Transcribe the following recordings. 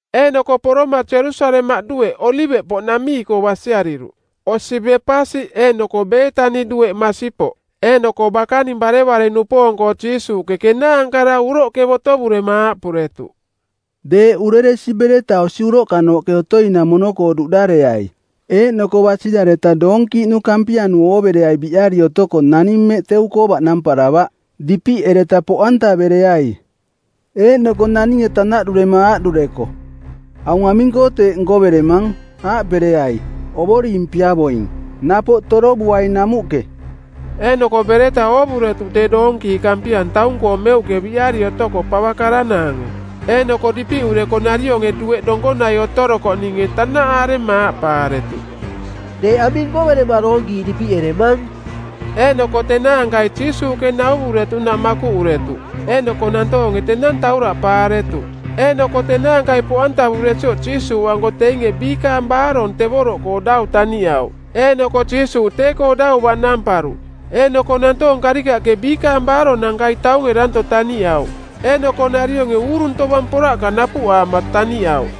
Eeꞌnoko poroma Jerusalemaꞌ dueꞌ Oliveꞌpoꞌnamii-koo basiariruꞌ, osi Bepasi eeꞌnoko Beetani dueꞌ masipoꞌ. Eeꞌnoko bakaning barevare-nupoong-koo Jiisuuꞌke kenaankara uroꞌke botovurema aaꞌpuretuꞌ, “Deeꞌ ureresi bereta osi uroꞌkanooꞌke otoi-namono-koo duꞌdareai. Eeꞌnoko basirareta doonkiiꞌnu kampianu oovereai biꞌari otoko naning mmeꞌ teu-koo baꞌnamparavaꞌ. Dipiꞌereta poꞌantavereai.” Eeꞌnoko naninge tanaꞌdurema aaꞌdureko, “Aung aming-koo teeꞌ nkoveremang? Aaꞌpereai, ‘Ovoring piavoing. Napoꞌ torovuaing namuꞌke.’” Eeꞌnoko bereta oovuretuꞌ tee doonkiiꞌ kampia taung-koo meuꞌke biꞌari otoko pava karanaange; Eeꞌnoko dipiꞌureko narionge dueꞌ donkonai otorokoꞌninge tanaꞌaarema aaꞌpaaretuꞌ, “Deeꞌ aming nkoverema doonkiiꞌ dipiꞌeremang?” Eeꞌnoko tenaankai Jiisuuꞌke nauvuretuꞌnaꞌ makuꞌuretuꞌ, eeꞌnoko nantoonge tenang tauraꞌpaaretuꞌ. Eeꞌnoko tenaankai poꞌantavuresioꞌ Jiisuuꞌanko teinge biikaang baarong tevoroꞌkoo dau taniꞌauꞌ. Eeꞌnoko Jiisuuꞌ tee-koo dau baꞌnamparuꞌ. Eeꞌnoko nantoong karikaꞌke biikaang baaronankai taunge danto taniꞌauꞌ, eeꞌnoko narionge uurung tovang poraꞌka napuꞌaama taniꞌauꞌ.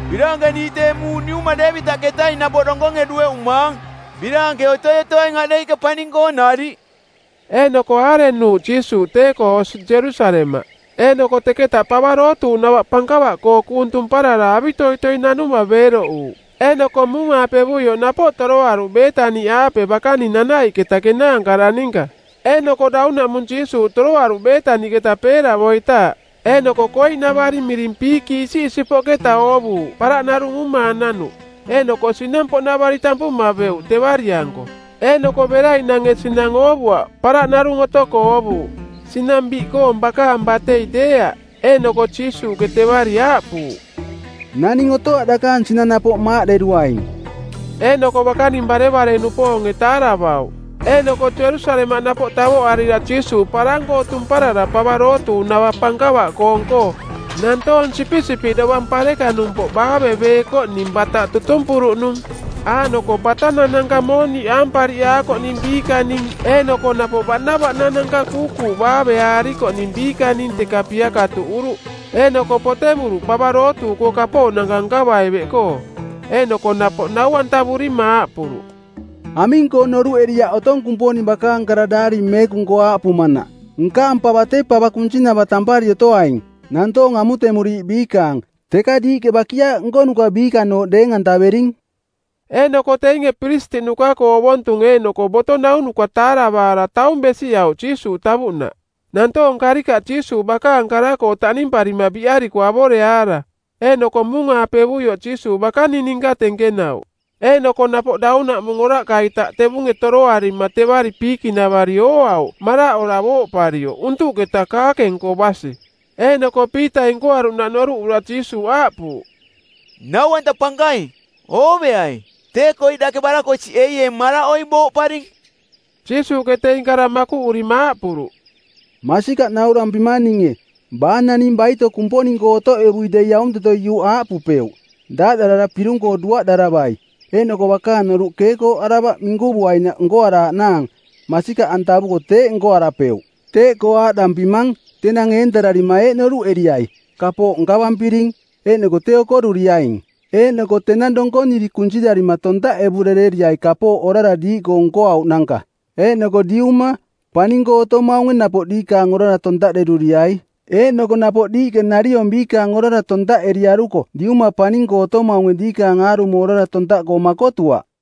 Biraankeniiꞌ tee muuꞌ niuma Deevitaꞌketaing napoꞌ donkonge dueꞌumaang! Biraanke otoi otoaing aꞌdeiꞌke paning-koo nariꞌ!” Eeꞌnoko aarenuuꞌ Jiisuuꞌ tee-koo osi Jerusalemaꞌ. Eeꞌnoko teketa pava dootuuꞌnava pankava-koo kuung tumparara avitoitoi nanuma beeroꞌuuꞌ. Eeꞌnoko muung-aapevuioꞌ napoꞌ toroaruꞌ Beetani-aape bakaning nanaiꞌketa kenaankara ninka. Eeꞌnoko daunaꞌmung Jiisuuꞌ toroaruꞌ Beetaniꞌketa peeravoitaaꞌ. Eeꞌnoko koiꞌnavari miring piikiꞌ isiꞌisipoꞌketa oovuuꞌ paraꞌ narung uumaananuꞌ. Eeꞌnoko sinang-poꞌnavari tampuma beuꞌ tevari-anko. Eeꞌnoko beraiꞌnange sinang oovuaꞌ, paraꞌ narung otoko oovuuꞌ, sinang biꞌkoong bakaang batei deeaꞌ. Eeꞌnoko Jiisuuꞌke tevari aaꞌpuuꞌ, “Naning otoaꞌ dakaang sinang napoꞌ maaꞌderuaing.” Eeꞌnoko bakaning barevare-nupoonge taaravauꞌ. Eeꞌnoko Jerusalemaꞌ napoꞌ tavoꞌarira Jiisuuꞌ parang-koo tumparara pava dootuuꞌnava pankava-koong-koo, nantoong sipisipiꞌ dovang parekanumpoꞌ baaveveekoꞌning bataꞌ tutumpuruꞌnung. Aaꞌnoko batanananka mooniꞌ aampariꞌaakoꞌning biikaning eeꞌnoko napoꞌ baꞌnavaꞌnananka kuukuuꞌ baaveaarikoꞌning biikaning teka piakatuꞌuruꞌ. Eeꞌnoko potevuruꞌ Pava Dootuuꞌkoo kapooꞌnanka nkavai beꞌkoo. Eeꞌnoko napoꞌ nau-antavurima aaꞌpuruꞌ, “Aming-koo noruꞌeriaꞌ otong Kumponing bakaang kara Daari Meekung-koo aaꞌpumanaꞌ ‘Nkaang pava tee pava kunsinava tampari otoaing, nantoong amutemuriiꞌ biikaang.’? Teka diiꞌke ‘bakiaaꞌ nkonuka biikanooꞌ’ deeng-antavering.” Eeꞌnoko teinge piristiꞌnuka-koo ovontunge eeꞌnoko boto naunuka taaravaara taung besiꞌauꞌ Jiisuuꞌ tavuꞌnaꞌ, nantoong karikaꞌ Jiisuuꞌ bakaang kara-koo taꞌnimparima biꞌariko avoreaara. Eeꞌnoko muung-aapevuioꞌ Jiisuuꞌ bakaning ninka tenkenauꞌ Eeꞌnoko napoꞌ daunaꞌmung oraꞌka-ita tevunge toroarima tevari piikiꞌnavari ooauꞌ maraꞌora booꞌparioꞌ untuꞌketa kaakeng-koo basi. Eeꞌnoko Piitai nkoaruꞌnaꞌ noruꞌura Jiisuuꞌ aaꞌpuuꞌ, “Nau-anta Pankaing, ooveai. Tee koiꞌ dake barakosiꞌeieeng maraꞌoi booꞌparing.” Jiisuuꞌke teing kara makuꞌurima aaꞌpuruꞌ, “Masikaꞌ naurampimang ninge, Baa naning baito Kumponing-koo otoꞌevui dei aunteto iuꞌ aaꞌpupeuꞌ, ‘Daaꞌdarara pirung-koo duaꞌdaravai,’ eeꞌnoko bakaang noruꞌ keekooꞌaravaꞌ minkuvuinaꞌ nkoaraaꞌnaang masikaꞌantavuko teeꞌ nkoarapeuꞌ. Teeꞌkoo aaꞌdampimang, tenang eentararima eeꞌ noruꞌeriai, ‘Kapooꞌ nkavampiring,’ eeꞌnoko tee okoruriaing. Eeꞌnoko tenang donkoniri kunsirarima tontaꞌevurereriai kapooꞌ orara diiꞌkoo nkoauꞌnanka. Eeꞌnoko Diuma, paning-koo otomaunge napoꞌ diikaang orara tontaꞌderuriai. Eeꞌnoko napoꞌ diiꞌke nariong biikaang orara tontaꞌeriaruko Diuma paning-koo otomaunge diikaang aarumo orara tontaꞌkoo makotuaꞌ.”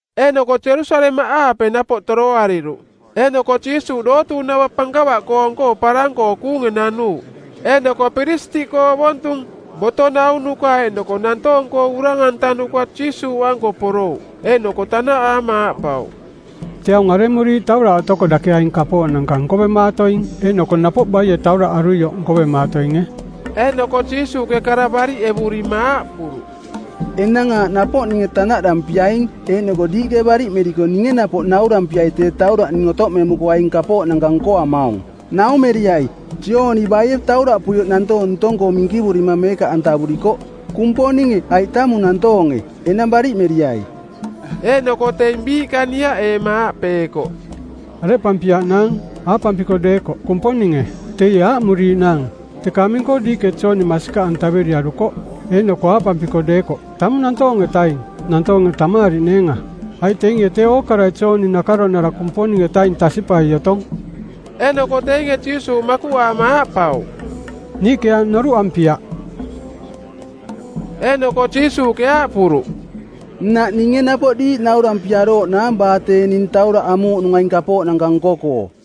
Eeꞌnoko Jerusalemaꞌaape napoꞌ toroariruꞌ eeꞌnoko Jiisuuꞌ dootuuꞌnava pankava-koong-koo parang-koo kuunge nanuuꞌ. Eeꞌnoko piristiꞌkoo ovontung, boto naunuka eeꞌnoko nantoong-koo urang-antanuka Jiisuuꞌanko porouꞌ. Eeꞌnoko tanaꞌaama aaꞌpauꞌ, “Tee aung aremuriiꞌ tauraꞌ otoko dake aing kapooꞌnanka nkovemaatoing? Eeꞌnoko napoꞌ baie tauraꞌ aruioꞌ nkovemaatoinge?” Eeꞌnoko Jiisuuꞌke kara bariꞌevurima aaꞌpuruꞌ, “Enang aaꞌ napoꞌ ninge tanaꞌdampiaing eeꞌnoko diiꞌke bariꞌmeriko ninge napoꞌ naurampiai tee tauraꞌ ning otoꞌmemuko aing kapooꞌnanka nkoamaung. Naumeriai, Jooni baie tauraꞌpuioꞌ nantoong ntong-koo minkivurima meekaꞌantavurikoꞌ, Kumponinge aiꞌ tamung nantoonge? Enang bariꞌmeriai.” Eeꞌnoko teing biiꞌka niaꞌeema aaꞌpeekoꞌ, “Areꞌpampiaꞌnaang? Aaꞌpampiko deekoꞌ, ‘Kumponinge,’ teie aaꞌmuriiꞌnaang, ‘Teka aming-koo diiꞌke Jooni masikaꞌantaveriarukoꞌ?’ Eeꞌnoko aaꞌpampiko deekoꞌ, ‘Tamung nantoong-etaing,’ nantoonge tamaariꞌneenga, aiꞌ teinge tee ookarai Jooni nakaronara Kumponing-etaing tasiꞌpai otong.” Eeꞌnoko teinge Jiisuuꞌ makuꞌaama aaꞌpauꞌ, “Niiꞌke aaꞌ noruꞌampiaꞌ.” Eeꞌnoko Jiisuuꞌke aaꞌpuruꞌ, “Nnaꞌ ninge napoꞌ diiꞌ naurampiarooꞌnaang baa tee ning tauraꞌ amuuꞌnung aing kapooꞌnanka nko-koo.”